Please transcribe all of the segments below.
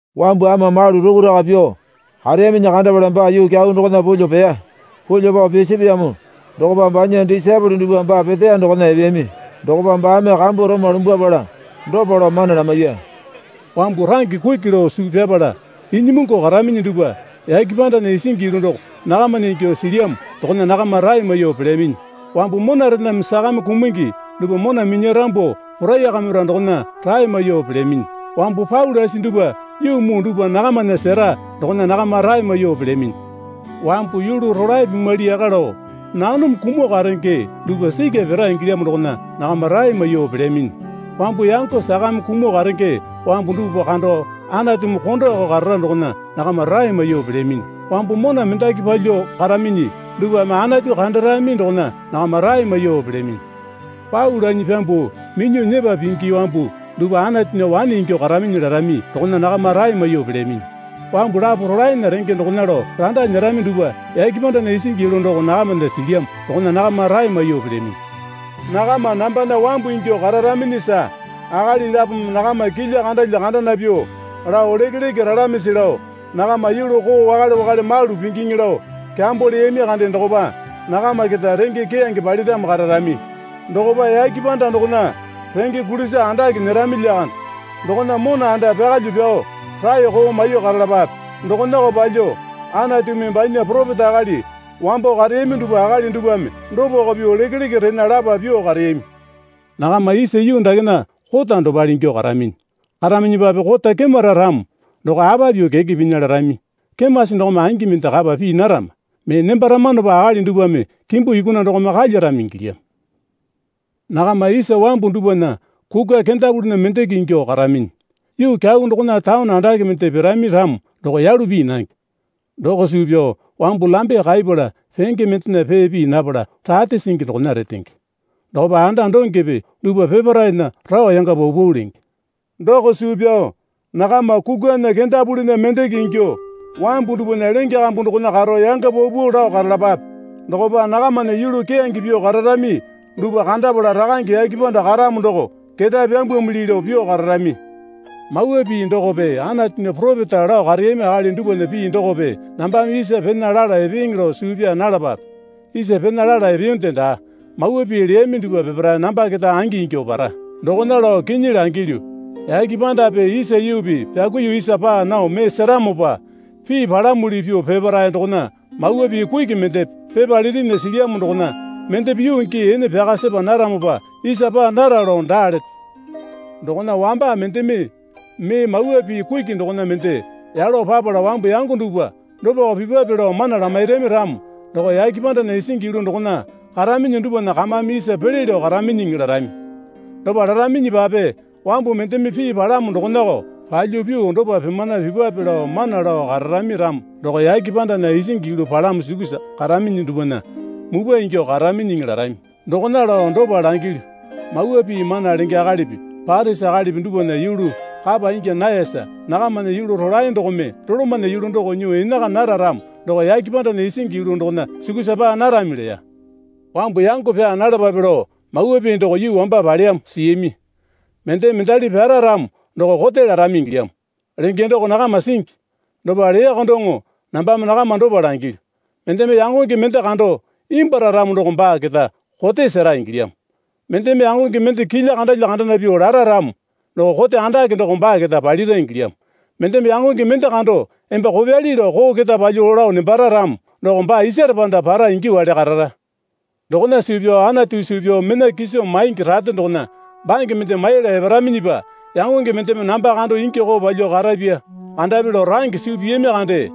Wambu ama malu rukuraka pyuo kareyaminyi kandapala baa yuu kyau dokona pulyuo peya. Pulyuo pao pisapeyamo dokopa banya disaepole dupwa baa peteya dokona epeyami. Dokopa baame kambu roma lumbwapala dopa lao mana lamaiya. Wambu range kuki lao suu pyapala inyimungu karaminyi dupwa yake pandana isingi yulu doko nakamana ingyuo silyamo dokona nakama rae maiyuo pelyaminyi. Wambu monarename sakame kumungi dupwa mona minyarambu poraiyakamira dokona rae maiyuo pelyaminyi. Wambu pau lasi dupwa yuu muu dupwa nakamana sera dokona nakama rae maiyuo pelyaminyi. Wambu yulu rolae pimwali yaka lao nanome kumuo karenge dupwa sikya pira ingilyamo dokona nakama rae maiyuo pelyaminyi. Wambu yango sakame kumuo karenge wambu dupwa kando Anatumi kondoko karara dokona nakama rae maiyuo pelyaminyi. Wambu mona mendaki palyuo karaminyi dupwame Anatu kandarami dokona nakama rae maiyuo pelyaminyi. Pau lanyi pyambuo minyuo nyepa pingi wambu dupwa Anatunya wane ingyuo karaminyi larami dokona nakama rae maiyuo pelyaminyi. Wambu lapo rolaena renge dokona lao randa nyerami dupwa yake pandana isingi yulu doko nakamana silyamo dokona nakama rae maiyuo pelyaminyi. Nakama nambana wambu ingyuo kararaminyisa akali lapome nakama kilya kandalya kandana pyuo lao lekeleke ralamisi lao nakama yulu koo wakale wakale malu pingiŋi lao kyambo leyami kande dokopa nakama keta renge keyange paliramo kararami. Dokopa yake panda dokona renge kulisa andake nyerami lyakande. Dokona mona anda pyakalyuo pyao raeko maiyuo karalapape. Dokonako palyuo Anatumi banya poropeta akali wambo kareyami dupwa akali dupwame dopako pyuo lekeleke rena lapa pyuo kareyami. Nakama isa yuu dakena kota dopale ingyuo karaminyi. Karaminyipape kota kemara ramo doko apa pyuo keke pinya larami. Kemasi dokome angi mende kapa pii narama. Mee nembaramanopa akali dupwame kimbu yukuna dokome kalyarami ingilyamo. Nakama isa wambu dupwana kukwa kendapulinyi mendeke ingyuo karaminyi. Yuu kyau dokona taone andake mende pirami ramo doko yalu pii nange. Doko suu pyao wambu lambe kaipala penge mendena pee pii napala rate singi dokona retenge. Dokopa anda dongepe dupwa peparaena rao yanga paupau lenge. Doko suu pyao nakama kukwana kendapulinya mendeke ingyuo wambu dupwana lenge kambu dokona karo yanga paupau lao karalapape. Dokopa nakamana yulu keyange pyuo kararami dupwa kandapala Rakange yake panda karamo doko ketae pyambwamili lao pyuo kararami. Mawa Pii dokope Anatunya poropeta lao kareyami akali dupwana pii dokope nambame isa pena lala epeeŋe lao suu pyaa nalapape. Isa pena lala epeyonde daa. Mawa pii leyami dupwa peparae namba keta angi ingyuo para. Dokona lao kinyi langilyu, yake pandape isa yuupi pyakuiyuo isa paa nao mee seramopa pii palamuli pyuo peparae dokona mawa pii kuki mendepe pepa litinya silyamo dokona mendepe yuu gii ene pyaka sepa naramopa isa paa nara lao daa leto. Dokona wamba mendeme mee Mawa Pii kuki dokona mende yalo papala wambu yango dupwa dopako pipwape lao mana lamairami ramo doko yake pandana isingi yulu dokona karaminyi dupwana kamame isa pele lao karaminyiŋi larami. Dopa laraminyipa wambu mendeme pii palamo dokonako palyuo pyuo dopa pimana pipwape lao mana lao kararami ramo doko yake pandana isingi yulu palamo sukusa karaminyi dupwana mupwa ingyuo karaminyiŋi larami. Dokona lao dopa langilyu. Mawa Pii mana lenge akalipi Parisi akalipi dupwana yulu kapa ingya nayasa nakamana yulu rolae dokome dolomana yulu doko nyuo enaka nara ramo doko yake pandana isingi yulu dokona sukusa paa narami leya. Wambu yango pyaa nalapape lao mawa pii doko yuu wamba paleyamo siyami. Mendeme mendali pyara ramo doko kote larami ingilyamo, lenge doko nakama singi. Dopa leyako doŋo nambame nakama dopa langilyu. Mendeme yangonge mende kando imbwuara ramo doko baa keta kote sera ingilyamo. Mendeme yangonge mende kilya kandalya kandana pyuo lara ramo doko kote andake doko baa keta palira ingilyamo. Mendeme yangonge mende kando, Emba kopyali lao koo keta palyuo lao nembara ramo doko baa isare panda para ingyuowale karara. Dokona suu pyao Anatu suu pyao mena kiso maingi rate dokona bange mende maiyala eparaminyipa yangonge mendeme namba kando ingi koo palyuo karapya kandapi lao range suu piyami kande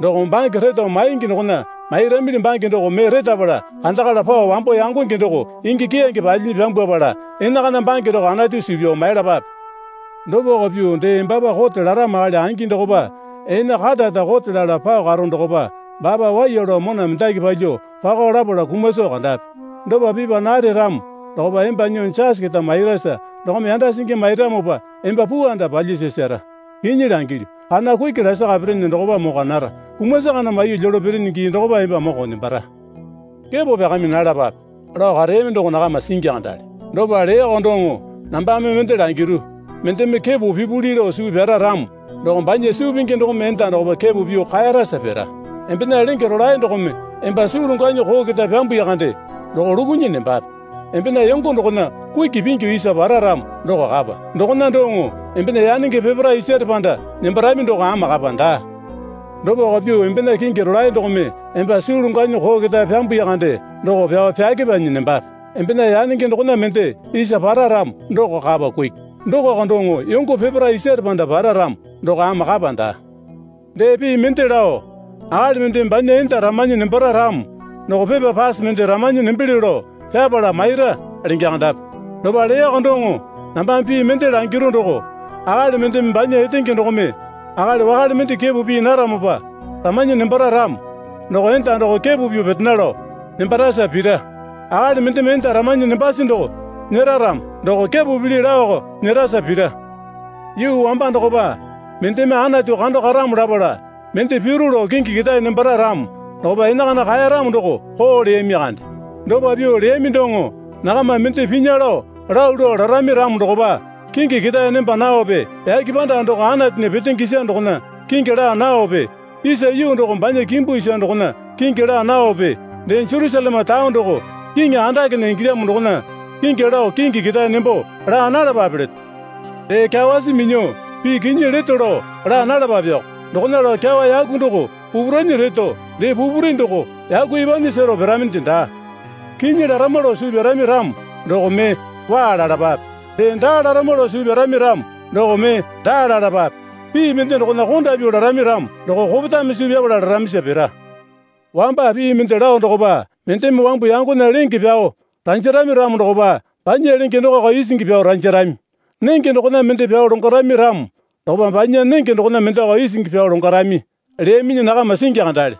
doko. Bange reto maingi dokona mairamili bange doko mee retapala kandakala pao wambo yangonge doko ingi keyange palyinyi pyambwapala enakana bange doko Anatu suu pyao maiyalapape. Dopako pyuo dee embapa kote laramo akali angi dokopa ene karara kote lala pao karo dokopa baapa waiya lao mona mendaki palyuo pako lapala kuma soo kandape. Dopa pipa nare ramo dokopa emba nyuo jasi keta mairasa dokome yanda singi mairamopa emba puu anda palyasasara. Kinyi langilyu, kana kuki lasaka pirinyi dokopa mokwa nara. Kumasi kana maiyuo lyolo pirinyi gii dokopa emba moko nembara. Kepo pyakami nalapape, lao kareyami doko nakama singi kandale. Dopa leyako doŋo nambame mende langiru. Mendeme kepo pipuli lao suu pyara ramo doko banya suu pingi dokome enda dokopa kepo pyuo kaeyarasa pira. Embena lenge rolae dokome emba suu longwanyi koo keta pyambuya kande doko lukunyi nembape. Embena yongo dokona kuki pingyu isa para ramo doko kapa. Dokona doŋo embena yanenge peparae isare panda nembarami doko ama kapa daa. Dopako pyuo embena kingi rolae dokome emba suu longwanyi koo keta pyambuya kande doko pyao pyakepanyi nembape. Embena yanenge dokona mende isa para ramo doko kapa kuki. Dokoko doŋo yongo peparae isare panda para ramo doko ama kapa daa. Dee pii mende lao, Akali mendeme banya enda ramanyi nembara ramo doko pepa pase mende ramanyi nembelyo lao pyapala maira, lenge kandapi. Dopa leyako doŋo nambame pil mende langiru doko, Akali mendeme banya etenge dokome akali wakale mende kepo pii naramopa ramanyi nembara ramo doko enda doko kepo pyuo petena lao nembarasa pira. Akali mendeme enda ramanyi nembasi doko nyera ramo doko kepo pili laoko nyerasa pira. Yuu wamba dokopa mendeme Anatu kando karamo lapala mende piro lao kingi ketae nembara ramo dokopa enakana kaeyaramo doko koo leyami kande. Dopa pyuo leyami doŋo nakama mende pinya lao lalu lao larami ramo dokopa, kingi ketae nemba nawape yake panda doko Anatunya petenge isa dokona kingi laa nawape isa yuu doko banya kimbu isa dokona kingi laa nawape dee Jerusaleme taone doko Kiŋi Andakena ingilyamo dokona kingi lao kingi ketae nembo laa nalapape leto. Dee kyawasi minyuo pii kinyi leto lao laa nalapapeko. Dokona lao kyawa yaku doko pupu ranyi reto dee pupuri doko yaku epanyi sero piraminde daa. Kinyi larama lao suu pyarami ramo doko mee, Waa, lalapape. Dee, Daa, larama lao suu pyarami ramo doko mee, Daa, lalapape. Pii mende dokona konda pyuo larami ramo doko kopetame suu pyapala laramisa pira. Wamba pii mende lao dokopa mendeme wambu yangonya lenge pyao ranjarami ramo dokopa banya lenge dokoko isingi pyao ranjarami. Nenge dokona mende pyao longwarami ramo dokopa banya nenge dokona mendeko isingi pyao longwarami, leyaminyi nakama singi kandale.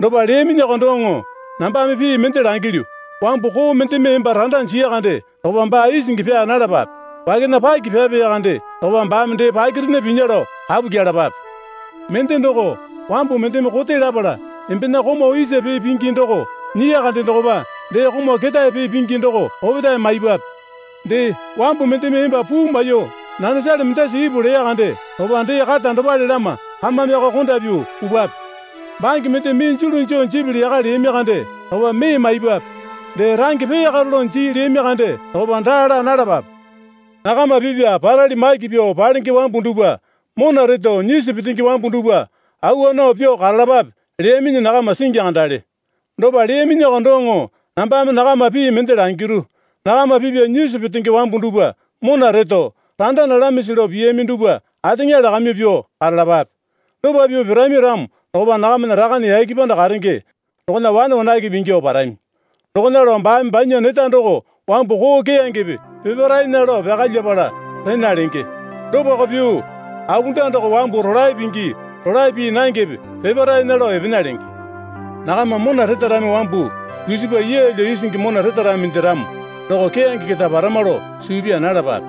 Dopa leyaminyiko doŋo nambame pii mende langilyu. Wambu koo mendeme emba randa jiya kande dokopa baa isingi pyaa nalapape. Wakena paki pyapeya kande dokopa baame dee pakirena pinya lao kapu kyelapape. Mende doko, wambu mendeme kote lapala embena komau isa pee pingi doko nyiya kande dokopa dee komau ketae pee pingi doko opetae maipwape. Dee, wambu mendeme emba puu maiyuo nanesale mendasa ipu leya kande dokopa dee kata dopale lama kamameko konda pyuo pupwape. Bange mende mee julu joo jipili yaka leyami kande dokopa mee maipwape. Dee, range peyakaro lao jii leyami kande dokopa daa laa nalapape. Nakama pipya parali maki pyuo palenge wambu dupwa mona reto nyisu petenge wambu dupwa awa nao pyuo karalapape, leyaminyi nakama singi kandale. Dopa leyaminyiko doŋo nambame nakama pii mende langiru. Nakama pipya nyisu petenge wambu dupwa mona reto, randa nalamisi lao piyami dupwa ateŋa lakamyuo pyuo karalapape. Dopa pyuo pirami ramo dokopa nakamana Rakane yake panda karenge dokona wane wanakepe ingyuo parami. Dokona lao baame banya neta doko wambu koo keyangepe peparaena lao pyakalyapala rena lenge. Dopako pyuo apunda doko wambu rolae pingi rolae pii nangepe peparaena lao epena lenge. Nakama mona retarami wambu dusipa yeelyo isingi mona retaraminde ramo doko keyange keta parama lao suu pyaa nalapape.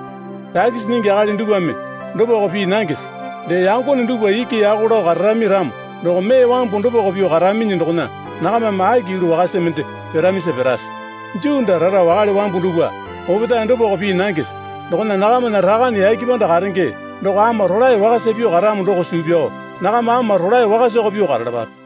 Takisi nyingi akali dupwame dopako pii nangese? Dee yangone dupwa iki yako lao kararami ramo doko mee wambu dopako pyuo karaminyi dokona nakamame aki yulu wakasa mende piramisa pirase? Juu daa rara wakale wambu dupwa opetae dopako pii nangese? Dokona nakamana Rakane yake panda karenge doko ama rolae wakasa pyuo karamo doko suu pyao nakama ama rolae wakasako pyuo karalapape.